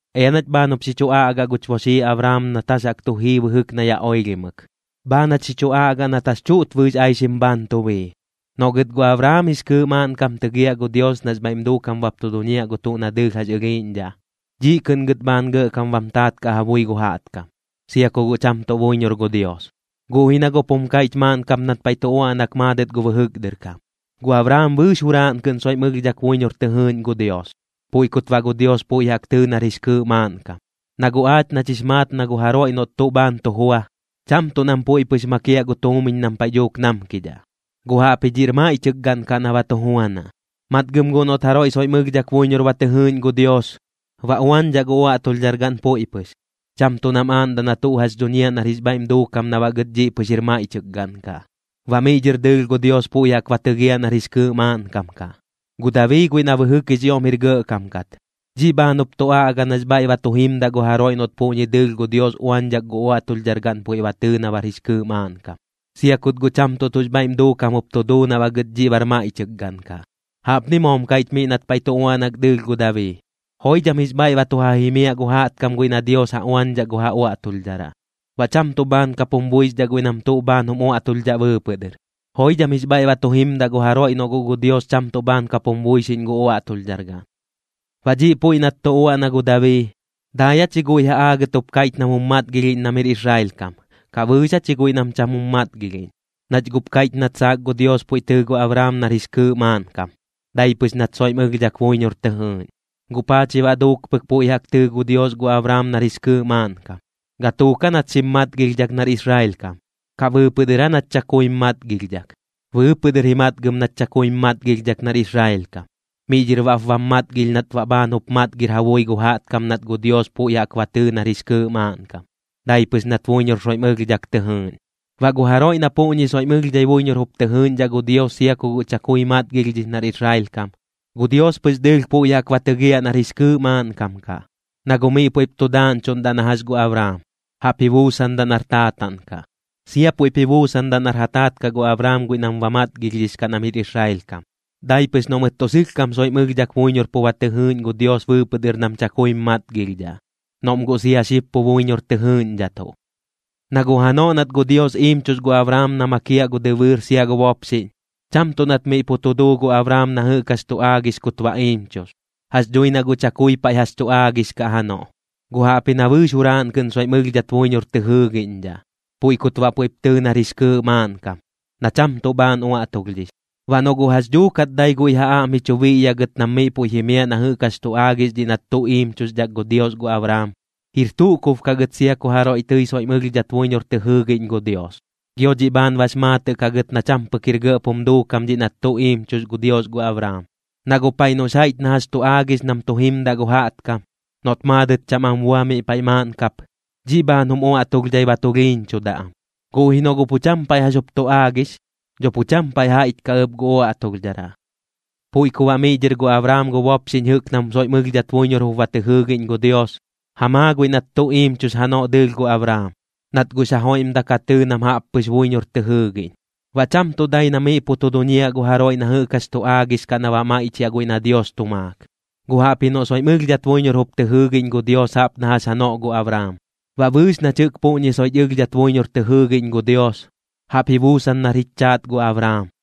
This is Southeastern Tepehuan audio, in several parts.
Ea nach bhaan jup xi chu aꞌgaꞌ guch boxii Abraam nat jax jaꞌk tu jii bɨjɨk na yaꞌ oilhimɨk, bhaan jach xi chu aꞌgaꞌ nat jax chuꞌt bɨɨx aixim bhaan tu bii. Noꞌ gɨt gu Abraam jix kɨɨꞌ maaꞌnkam tɨgiaꞌ gu Dios nax bhaiꞌm duukam bap tu duñiaꞌ gu tuꞌ na dɨɨlh jax ɨlhiiꞌñdhaꞌ, dhiꞌ kɨꞌn gɨt bhaan gɇꞌkam bam taat kaꞌ ja bui gu jaꞌtkam, sia ku guꞌ cham tuꞌ buiñor gu Dios. Guꞌ ji na guꞌp jum kaiꞌch maaꞌn kap nat paiꞌ tu uaꞌnak maadɨt gu bɨjɨk dɨr kam: “Gu Abraam bɨɨx juraaꞌn kɨꞌn soiꞌm ɨlhdhak buiñor tɨ jɨɨꞌñ gu Dios, puiꞌ kut baꞌ gu Dios puiꞌ jaꞌk tɨɨ nar jix kɨɨꞌ maaꞌnkam.” Na guꞌ aach nach jix maat na gu jaroiꞌ noꞌt tuꞌ bhaan tu jua, cham tuꞌ nam puiꞌ pɨx makiaꞌ gu tuumiñ nam paiꞌ dhuuk namkidhaꞌ, guꞌ jaꞌpji dhiꞌr maiꞌchɨk gaꞌn kaꞌ na ba tu juanaꞌ. Matgɨm guꞌ noꞌt jaroiꞌ soiꞌm ɨlhdhak buiñor ba tɨ jɨɨꞌñ gu Dios, ba uañdhaꞌ gu uaꞌtulhdhargaꞌn puiꞌ pɨx, cham tuꞌ nam aaꞌndaꞌ na tuꞌ jax dhuñiaꞌ nar jix bhaiꞌm duukam na baꞌ gɨt dhiꞌ pɨx jir maiꞌchɨk gaꞌn kaꞌ. Baꞌ miꞌ dhɨr dɨɨlh gu Dios puiꞌ jaꞌk ba tɨgiaꞌ nar jix kɨɨꞌ maaꞌnkam kaꞌ. Gu Dabii guiꞌ na bɨjɨk jix ioꞌm jir gɇꞌkam kat, dhiꞌ bhaan jup tu aꞌga nax bhaiꞌ ba tu jimdaꞌ gu jaroiꞌ noꞌt puꞌñi dɨɨlh gu Dios uañdhak gu uaꞌtulhdhargaꞌn puiꞌ ba tɨɨ na bar jix kɨɨꞌ maaꞌnkam, sia kut guꞌ cham tuꞌ tuꞌx bhaiꞌm duukam jup tu duu na baꞌ gɨt dhiꞌ bar maiꞌchɨk gaꞌn kaꞌ. Jaꞌpni moom kaiꞌch miꞌ nat paiꞌ tu uaꞌnak dɨɨlh gu Dabii: Joidham jix bhaiꞌ ba tu ja jimiaꞌ gu jaꞌtkam guiꞌ na Dios ja uañdhaꞌ gu ja uaꞌtulhdharaꞌ, baꞌ cham tuꞌ bhaan kap jum buixdhaꞌ guiꞌ nam tuꞌ bhaan jum uaꞌtulhdhaꞌ bɨɨpɨꞌ dɨr. Joidham jix bhaiꞌ ba tu jimdaꞌ gu jaroiꞌ noꞌ guꞌ Dios cham tuꞌ bhaan kap jum buixiꞌñ gu uaꞌtulhdhargaꞌn. Baꞌ dhiꞌ puiꞌ nat tu uaꞌna gu Dabii, ¿dai aa chi guiꞌ ja aagɨt jup kaiꞌch nam jum matgilhiꞌñ nam jir Israel kam, kaꞌ bɨɨx aa chi guiꞌ nam cham jum matgilhiꞌñ? Nach guꞌp kaiꞌch nat saak gu Dios puiꞌ tɨɨ gu Abraam nar jix kɨɨꞌ maaꞌnkam, dai pɨx nat soiꞌm ɨlhdhak buiñor tɨ jɨɨꞌñ. ¿Guꞌ paa chi baꞌ duuk pɨk puiꞌ jaꞌk tɨɨ gu Dios gu Abraam nar jix kɨɨꞌ maaꞌnkam? ¿Gatuuk aa nat xim matgilhdhak nar Israel kam, kaꞌ bɨɨpɨꞌ dɨr aa nat chakuim matgilhdhak? Bɨɨpɨꞌ dɨr ji matgɨm nat chakuim matgilhdhak nar Israel kam. Miꞌ dhɨr baꞌp bam matgilh nat baꞌ bhaan jup matgir ja bui gu jaꞌtkam nat gu Dios puiꞌ jaꞌk ba tɨɨ nar jix kɨɨꞌ maaꞌnkam, dai pɨx nat buiñor soiꞌm ɨlhdhak tɨ jɨɨꞌñ. Baꞌ gu jaroiꞌ na puꞌñi soiꞌm ɨlhdhai buiñor jup tɨ jɨɨꞌñdhaꞌ gu Dios sia ku guꞌ chakui matgilhdhix nar Israel kam, gu Dios pɨx dɨɨlh puiꞌ jaꞌk ba tɨgiaꞌ nar jix kɨɨꞌ maaꞌnkam kaꞌ, na guꞌ miꞌ puiꞌp tu daaꞌñchuꞌndaꞌ na jax gu Abraam, jaꞌp ji buusandaꞌ nar taataꞌn kaꞌ. Sia puiꞌp ji buusandaꞌ nar ja taat kaꞌ gu Abraam guiꞌ nam ba matgilhdhix kaꞌ nam jir Israel kam, dai pɨx noꞌ mɨt tuꞌ sɨlhkam soiꞌm ɨlhdhak buiñor pu ba tɨ jɨɨꞌñ gu Dios bɨɨpɨꞌ dɨr nam chakuim matgilhdhaꞌ, noꞌm guꞌ sia xib pu buiñor tɨ jɨɨꞌñdhatuꞌ. Na guꞌ janoꞌ nat gu Dios iimchux gu Abraam na makiaꞌ gu dɨbɨɨr sia gu bopxiꞌñ, cham tuꞌ nat miꞌ pu tu duu gu Abraam na jɨꞌk jax tu aagix kut baꞌ iimchux. Jax dhui na guꞌ chakui paiꞌ jax tu aagix kaꞌ janoꞌ. Guꞌ jaꞌpji na bɨɨx juraaꞌn kɨꞌn soiꞌm ɨlhdhat buiñor tɨ jɨɨgiꞌñdhaꞌ, puiꞌ kut baꞌ puiꞌp tɨɨ nar jix kɨɨꞌ maaꞌnkam, na cham tuꞌ bhaan uaꞌtulhdhix. Baꞌ noꞌ guꞌ jax dhuukat dai guiꞌ ja aꞌm ji chu biꞌyaꞌ gɨt nam miꞌ puiꞌ jimiaꞌ na jɨꞌk jax tu aagix dhiꞌ nat tuꞌ iimchuxdhak gu Dios gu Abraam, jir tuꞌ kub kaꞌ gɨt sia ku jaroiꞌ tɨi soiꞌm ɨlhdhat buiñor tɨ jɨɨgiꞌñ gu Dios, gio dhiꞌ bhaan bax maatɨꞌ kaꞌ gɨt na cham pɨk jir gɇꞌp jum duukam dhiꞌ nat tuꞌ iimchux gu Dios gu Abraam. Na guꞌ paiꞌ noꞌx jaiꞌch na jax tu aagix nam tu jimdaꞌ gu jaꞌtkam, noꞌt maadɨt cham am bua miꞌ paiꞌ maaꞌn kap, dhiꞌ bhaan jum uaꞌtulhdhai ba tulhiiñchudaꞌ am. Guꞌ ji noꞌ guꞌ pu cham paiꞌ jax jup tu aagix, dho pu cham paiꞌ jaiꞌch kaꞌ ɨp gu uaꞌtulhdharaꞌ. Puiꞌ ku baꞌ miꞌ dhɨr gu Abraam gu bopxiꞌñ jɨꞌk nam soiꞌm ɨlhdhat buiñor jup ba tɨ jɨɨgiꞌñ gu Dios, ja maa guiꞌ nat tuꞌ iimchux janoꞌ dɨɨlh gu Abraam, nat guꞌx ja joiꞌmdak ja tɨɨ nam jaꞌp pɨx buiñor tɨ jɨɨgiꞌñ. Baꞌ cham tuꞌ dai na miꞌ pu tu duñiaꞌ gu jaroiꞌ na jɨꞌk jax tu aagix kaꞌ na baꞌ maiꞌchiaꞌ guiꞌ na Dios tu maak, guꞌ jaꞌpji noꞌ soiꞌm ɨlhdhat buiñor jup tɨ jɨɨgiꞌñ gu Dios jaꞌp na jax janoꞌ gu Abraam. Baꞌ bɨɨx nach jɨꞌk puꞌñi soiꞌch ɨlhdhat buiñor tɨ jɨɨgiꞌñ gu Dios, jaꞌp ji buusan nar jich chaat gu Abraam.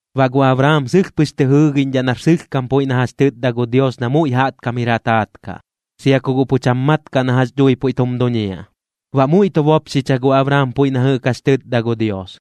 Baꞌ gu Abraam sɨlh pɨx tɨ jɨɨgiꞌñdhaꞌ nar sɨlhkam puiꞌ na jax chɨtda gu Dios na muiꞌ jaꞌtkam jir ja taat kaꞌ, sia ku guꞌ pu cham mat kaꞌ na jax dhui puiꞌ tum duñiaꞌ. Baꞌ muiꞌ tu bopxicha gu Abraam puiꞌ na jɨꞌk jax tɨtda gu Dios.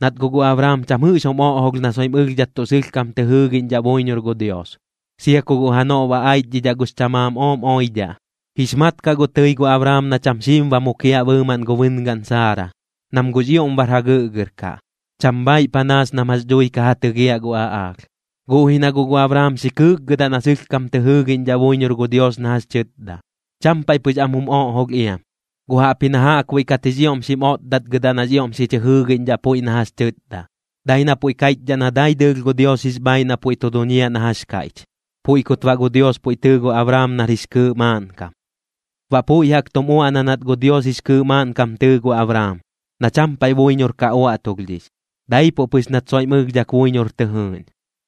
Nat guꞌ gu Abraam cham jɨꞌx jum oꞌjolh na soiꞌm ɨlhdhat tuꞌ sɨlhkam tɨ jɨɨgiꞌñdhaꞌ buiñor gu Dios, sia ku guꞌ janoꞌ ba aichdhidhaꞌ gux chamaam ooꞌm oidhaꞌ. Jix mat kaꞌ guꞌ tɨi gu Abraam na cham xiim ba mukiaꞌ bɨɨmaꞌn gu bɨngaꞌn Saara, nam guꞌx ioꞌm bar jagɨꞌgɨr kaꞌ, cham bhaaiꞌ panaas nam jax dhui ka ja tɨgiaꞌ gu aꞌaalh. Guꞌ ji na guꞌ gu Abraam xi kɨɨkgɨdaꞌ na sɨlhkam tɨ jɨɨgiꞌñdhaꞌ buiñor gu Dios na jax tɨtda, cham paiꞌ pɨx am jum oꞌjolh iam, guꞌ jaꞌpji na jaꞌkbuiꞌ kat jix ioꞌm xim otdatgɨdaꞌ nax ioꞌm xi chɨ jɨɨgiꞌñdhaꞌ puiꞌ na jax tɨtda, dai na puiꞌ kaiꞌchdhaꞌ na dai dɨɨlh gu Dios jix bhaaiꞌ na puiꞌ tu duñiaꞌ na jax kaiꞌch. Puiꞌ kut baꞌ gu Dios puiꞌ tɨɨ gu Abraam nar jix kɨɨꞌ maaꞌnkam. Baꞌ puiꞌ jaꞌk tum uaꞌna nat gu Dios jix kɨɨꞌ maaꞌnkam tɨɨ gu Abraam, na cham paiꞌ buiñor ka uaꞌtulhdhix, daipuꞌ pɨx nat soiꞌm ɨlhdhak buiñor tɨ jɨɨꞌñ.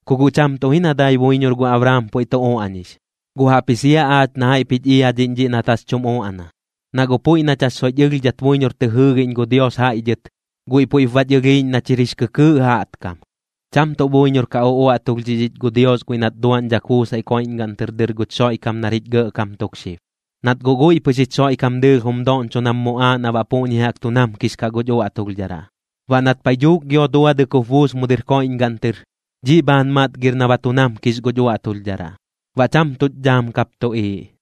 Ku guꞌ cham tuꞌ ji na dai buiñor gu Abraam puiꞌ tu uaꞌñix, guꞌ jaꞌpji sia aach na jaiꞌp jich iadhiꞌñ dhiꞌ nat jax chum uaꞌna. Na guꞌ puiꞌ nach jax soiꞌch ɨlhdhat buiñor tɨ jɨɨgiꞌñ gu Dios jaiꞌ dhɨt, guiꞌ puiꞌp bach ɨlhiiꞌñ nach jir jix kɨkɨɨꞌ jaꞌtkam, cham tuꞌ buiñor ka uꞌuaꞌtulhdhix ich gu Dios guiꞌ nat duaꞌñdhak buusaiꞌ koiꞌñgaꞌn tɨr dɨr guch Xoiꞌkam nar jich gɇꞌkam tuk xib. Nat guꞌ guiꞌ pɨx jich Xoiꞌkam dɨɨlh jum doꞌñcho nam muꞌaaꞌ na baꞌ puꞌñi jaꞌk tu namkix kaꞌ guch uaꞌtulhdharaꞌ. Baꞌ nat paiꞌ dhuuk gio duadɨk jup buus mu dɨr koiꞌñgaꞌn tɨr, dhiꞌ bhaan matgir na ba tu namkix guch uaꞌtulhdharaꞌ, baꞌ cham tuch dhaam kap tuꞌiiꞌ.